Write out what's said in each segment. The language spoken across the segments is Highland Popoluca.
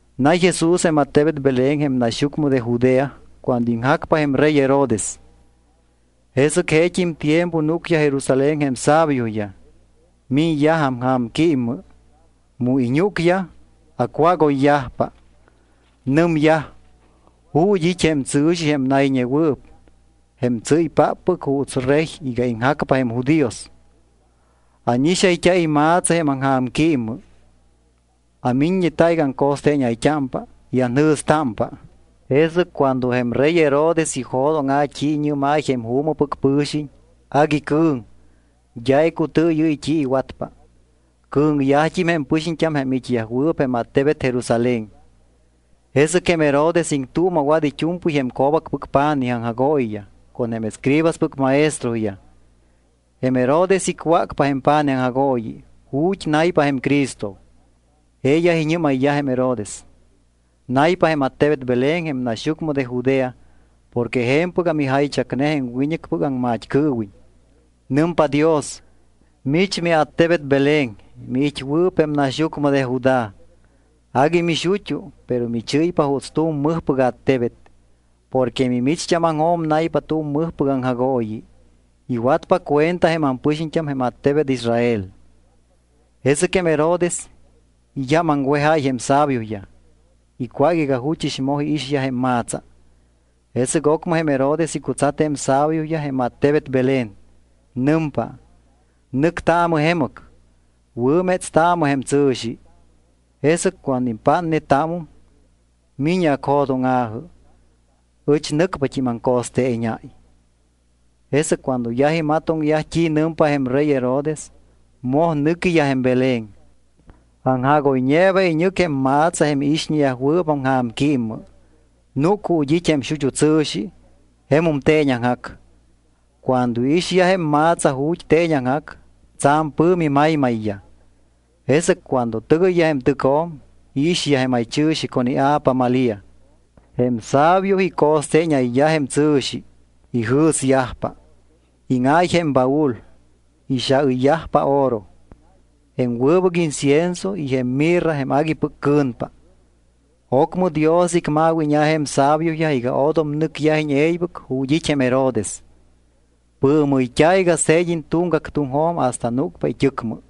Nay Jesús jém attebet Belén jém naxyucmɨ de Judea cuando iŋjacpa jém rey Herodes. Jesɨc jeet́im tiempo núcyaj Jerusalén jém sabioyaj. Miñyaj aŋja̱mquímmɨ. Mu iñúcyaj, acwágoyyajpa. Nɨmyaj: —¿Ju̱t́ it́ jém tsɨ̱xi jém nayñewɨɨp, jém tsɨ́ypáppɨc juuts Rey iga iŋjacpa jém judíos? Ánixayt́a ima̱tsa jém aŋja̱mquímmɨ. Amiññeta iga aco̱steeñayt́ámpa y anjɨ̱stámpa. Jesɨc cuando jém rey Herodes ijo̱dóŋa̱ t́i iñɨ́máy jém juumɨpɨc pɨ̱xiñ, agui cɨ̱ŋ, d́a icutɨɨyɨ́y t́i iwatpa. Cɨ̱ŋyajt́im jém pɨxiñt́am jém it́yajwɨɨp jém attebet Jerusalén. Jesɨc jém Herodes iŋtuuma̱wat it́u̱mpɨy jém co̱bacpɨc pa̱nij aŋjagooyiyaj con jém escribaspɨc maestroyaj. Jém Herodes icwácpa jém pa̱nij aŋjagooyi ju̱t́ naypa jém Cristo. Jeeyaj iñɨ́mayyaj jém Herodes: —Naypa jém attebet Belén jém naxyucmɨ de Judea porque je̱mpɨgam ijaychacne jém wiñɨcpɨc aŋmat́cɨɨwiñ. Nɨmpa Dios: Mich miattebet Belén, miit́wɨɨp jém naxyucmɨ de Judá, agui mixut́u, pero michɨ́ypa juuts tu̱m mɨjpɨc attebet porque mimicht́ámaŋjo̱m naypa tu̱m mɨjpɨc aŋjagooyi. Iwatpa cuenta jém ampɨxiñt́am jém attebet Israel. Jesɨc jém Herodes iyámaŋwejáy jém sabioyaj. Icwác iga juchɨs moj iixyaj jém ma̱tsa. Jesɨc ocmɨ jém Herodes icutsat jém sabioyaj jém attebet Belén. Nɨmpa: —Nɨctaamɨ jemɨc. Wɨ̱métstaamɨ jém tsɨ̱xi. Jesɨc cuando impátnetámum, mi̱ñɨ acjo̱dóŋa̱jɨ. Ɨch nɨcpat́im aŋco̱steeñáy. Jesɨc cuando yaj imatoŋyaj t́i nɨmpa jém rey Herodes, moj nɨquiyaj jém Belén. Aŋjagoyñeeba iñɨc jém ma̱tsa jém iixñeyajwɨɨp aŋja̱mquímmɨ. Núc ju̱t́ it́ jém xut́u tsɨ̱xi, jemum teeñaŋjac. Cuando iixyaj jém ma̱tsa ju̱t́ teeñaŋjac, tsa̱m pɨ̱mi maymayyaj. Jesɨc cuando tɨgɨyyaj jém tɨcjo̱m, iixyaj jém jaychɨ̱xi con ia̱pa Malía. Jém sabio ico̱steeñayyaj jém tsɨ̱xi. Ijɨ̱syajpa. Íŋáy jém ibaúl, ixaɨyyajpa oro, jém wɨbɨc incienso y jém mirra jém aguipɨc cɨ̱npa. Ocmɨ Dios icma̱wíña̱ jém sabioyaj iga odom nɨcyajiñ e̱ybɨc ju̱t́ it́ jém Herodes. Pɨɨmɨyt́a̱ iga se̱d́iñ tuŋgac tuŋjo̱m hasta núcpa it́ɨcmɨ.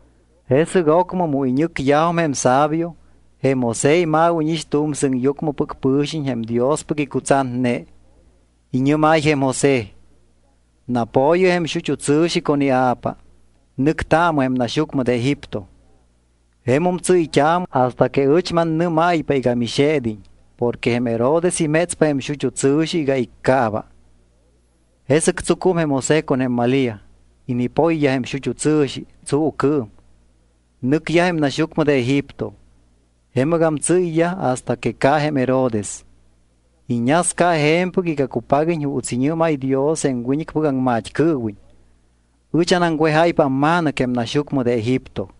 Jesɨc ocmɨ mu iñɨcyajum jém sabio, jém José ima̱wíñix tu̱m sɨŋyucmɨpɨc pɨ̱xiñ jém Diospɨc icutsatne. Iñɨ́máy jém José: —Napo̱yɨ jém xut́u tsɨ̱xi con ia̱pa. Nɨctaamɨ jém naxyucmɨ de Egipto. Jemum tsɨ́yt́aamɨ hasta que ɨch mannɨ́máypa iga mixe̱d́iñ porque jém Herodes imétspa jém xut́u tsɨ̱xi iga iccaaba. Jesɨc tsucum jém José con jém Malía. Inipoyyaj jém xut́u tsɨ̱xi tsuucɨɨm. Nɨcyaj jém naxyucmɨ de Egipto. Jemɨgam tsɨ́yyaj hasta que ca jém Herodes. Iñasca je̱mpɨc iga cupaguiñ juuts iñɨ́máy Dios jém wiñɨcpɨc aŋmat́cɨɨwiñ: “Ɨch anaŋwejáypa amma̱nɨc jém naxyucmɨ de Egipto.”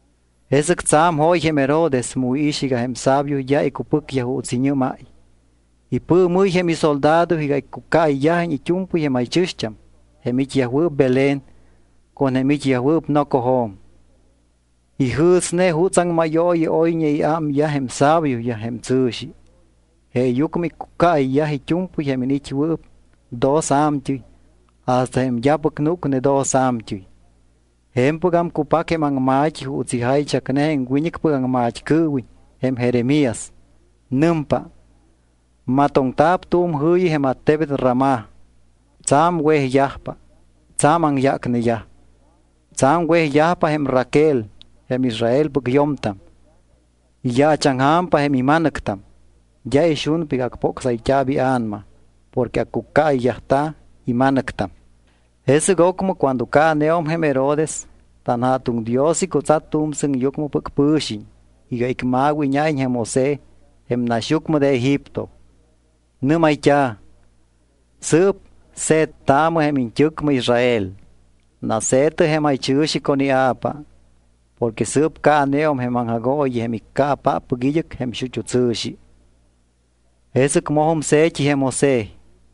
Jesɨc tsa̱m jóy jém Herodes mu iix iga jém sabio d́a icupɨcyaj juuts iñɨ́máy. Ipɨɨmɨ́y jém isoldado iga iccucaayyajiñ it́u̱mpɨy jém jaychɨ̱xt́am jém it́yajwɨɨp Belén con jém it́yajwɨɨp nocojo̱m. Ijɨ̱sne jutsaŋ mayooyi oyñe iámyaj jém sabioyaj jém tsɨ̱xi. Jeeyucmɨ iccucaayyaj it́u̱mpɨy jém iniit́wɨɨp dos a̱mt́ɨy hasta jém d́apɨc núcne dos a̱mt́ɨy. Je̱mpɨgam cupac jém aŋma̱t́i juuts ijaychacne jém wiñɨcpɨc aŋmat́cɨɨwiñ jém Jeremías. Nɨmpa: Matoŋta̱p tu̱m jɨ̱yi jém attebet Ramá. Tsa̱m wejyajpa, tsa̱m aŋyácneyaj. Tsa̱m wejyajpa jém Raquel, jém Israelpɨc yo̱mtam, iyaachaŋja̱mpa jém ima̱nɨctam. D́a ixunpa iga acpocsayt́a̱p ia̱nama porque accucaáyayyajt́a̱ ima̱nɨctam. Jesɨc ocmɨ cuando caaneum jém Herodes, tanJa̱tuŋ Dios icutsat tu̱m sɨŋyucmɨpɨc pɨ̱xiñ iga icma̱wíña̱iñ jém José jém naxyucmɨ de Egipto, nɨ́mayt́a̱: —Sɨɨp se̱ttaamɨ jém iñt́ɨcmɨ Israel. Nase̱tɨ jém jaychɨ̱xi con ia̱pa. Porque sɨɨp caaneum jém aŋjagooyi jém iccaapáppɨc id́ɨc jém xut́u tsɨ̱xi. Jesɨc mojum se̱t́i jém José.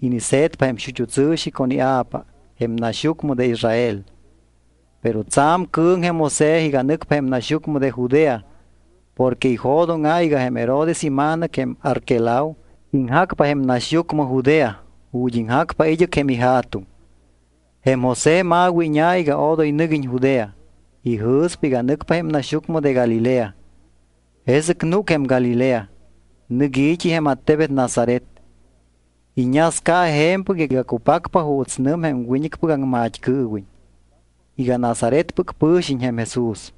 Inise̱tpa jém xut́u tsɨ̱xi con ia̱pa jém naxyucmɨ de Israel. Pero tsa̱m cɨ̱ŋ jém José iga nɨcpa jém naxyucmɨ de Judea porque ijo̱dóŋa̱ iga jém Herodes ima̱nɨc jém Arquelao iŋjacpa jém naxyucmɨ Judea ju̱t́ iŋjacpa id́ɨc jém ija̱tuŋ. Jém José ma̱wíña̱ iga odoy nɨguiñ Judea. Ijɨ̱spa iga nɨcpa jém naxyucmɨ de Galilea. Jesɨc núc jém Galilea, nɨc i̱t́i jém attebet Nazaret. Iñasca je̱mpɨc iga cupacpa juuts nɨm jém wiñɨcpɨc aŋmat́cɨɨwiñ iga Nazaretpɨc pɨ̱xiñ jém Jesús.